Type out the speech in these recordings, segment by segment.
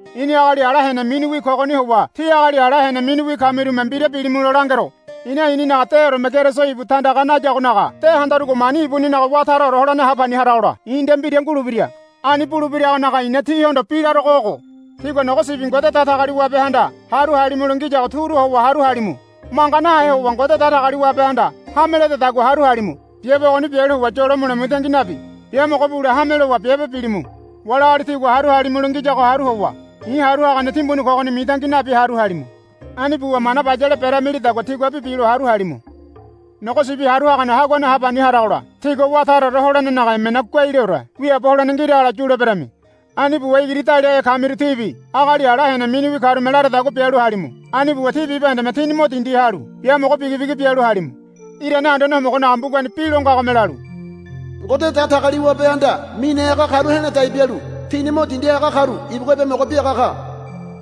I̱ni agali ala hene miniwi kogoni howa tí agali ala hene miniwi kamirume mbira bilimulo langero. I̱na i̱ninaga deoreme Keriso ibu tandaga nayagonaga de handarugo mani ibuninaga wá taraore holene ha pani haragola i̱ nde mbira ngulebira. Ani bulebiragonaga i̱na tíhondo bi larogo ogo. Tígua nogo sibi Ngode Datagaliwabehanda haru halimulo ngiyago turu howa haru halimu. Manga nahe howa Ngode Datagaliwabehanda hame ledadagua haru halimu. Biabe ogoni bialu howa yolo mule mitangi nabi biamogo bule hame lowa biabe bilimu. Wali agali tígua haru halimulo ngiyago haru howa i̱ haru hagane timbuni kogoni mitangi nabi haru halimu. Ani buwa mana bayale beremilidagua tiguabi bilo haru halimu. Nogo Sibi Haru Hagane Haguane ha pani haragola tígua wá taraore holenenaga emena guaileore wiaabo holene ngiragola yuleberami. Ani buwa igiri daliahe kamiru tíbi agali ala hene miniwi karume laradagua bialu halimu. Ani buwa tí bibahendeme tíni mo dindi halu biamogo bigibigi bialu halimu. Irane Anduane Homogonaga mbugani bi lo ngagome lalu, Ngode Datagaliwabehanda mine haga karu he̱la dai bialu tini mo dindi haga karu ibugua biamogo biaga ka,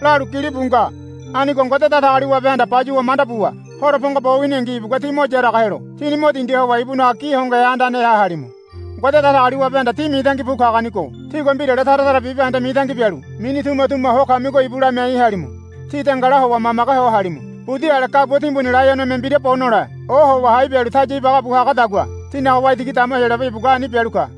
lalu gilibu nga. Anigo Ngode Datagaliwabehanda bayuwa manda buwa horo pongo bo winingi ibugua tí mo yaraga helo tíni mo dindi howa ibunaga gi hongohe andaneha halimu. Ngode Datagaliwabehanda tí mitangi bu kagonigo tígua mbirale tara tara bibahende mitangi bialu mini tumatuma ho kamigo ibu lamiai halimu. Tí dengala howa mamage ho halimu. Budi ale gabua timbuni laionome mbira bo nole ohowa hai bialu taya ibagabu hagadagua tínaga waitigi dama Heyolabe ibugua ani bialu ka.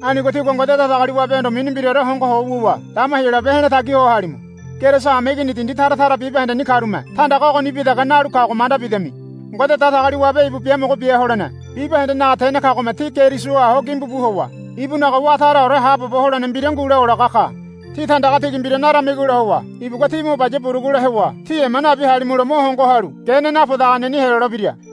Anigo tígua Ngode Datagaliwabehondo mini mbiraore hongoho wuwa dama Heyolabe he̱la tagi ho halimu. Keriso hameigini dindi tara tara bibahendeni karume tandaga ogonibi dege nalu kago manda bidami. Ngode Datagaliwabe ibu biamogo bia holene bibahendenaga tene kagome tí Kerisoha ho gimbubu howa ibunaga wá taraore haabobo holene mbira ngule olaga ka. Tí tandaga tigi mbira naramigola howa ibugua tí mo baya burugule howa tí ema nabi halimulo mo hongo halu gene napodaganeni helolebira.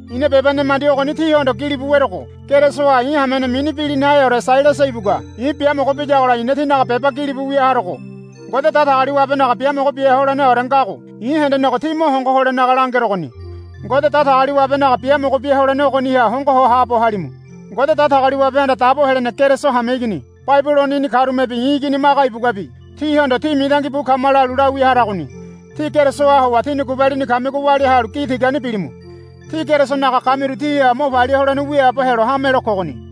I̱na beba nemandi ogoni tíhondo gilibu werogo Kerisoha i̱ hamene mini bilinaheore Sailasa ibugua i̱ biamogo biyagola i̱na tínaga beba gilibu wia harogo. Ngode Datagaliwabenaga biamogo bia holeneore ngago i̱ hendenego tí mo hongo holenaga langerogoni. Ngode Datagaliwabenaga biamogo bia holene ogoniha hongo ho haabo halimu. Ngode Datagaliwabehanda dabo helene Keriso hameigini Babilononi karumebi i̱ igini Maga ibuguabi tíhondo, Tí mitangi bu kama, lalu lawia haragoni. Tí Kerisoha howa tíni gubalini kamigo walia halu gi tigani bilimu. Tí Kerisonaga kamiru tíha mo palia holene wiaabo helo hamelo kogoni.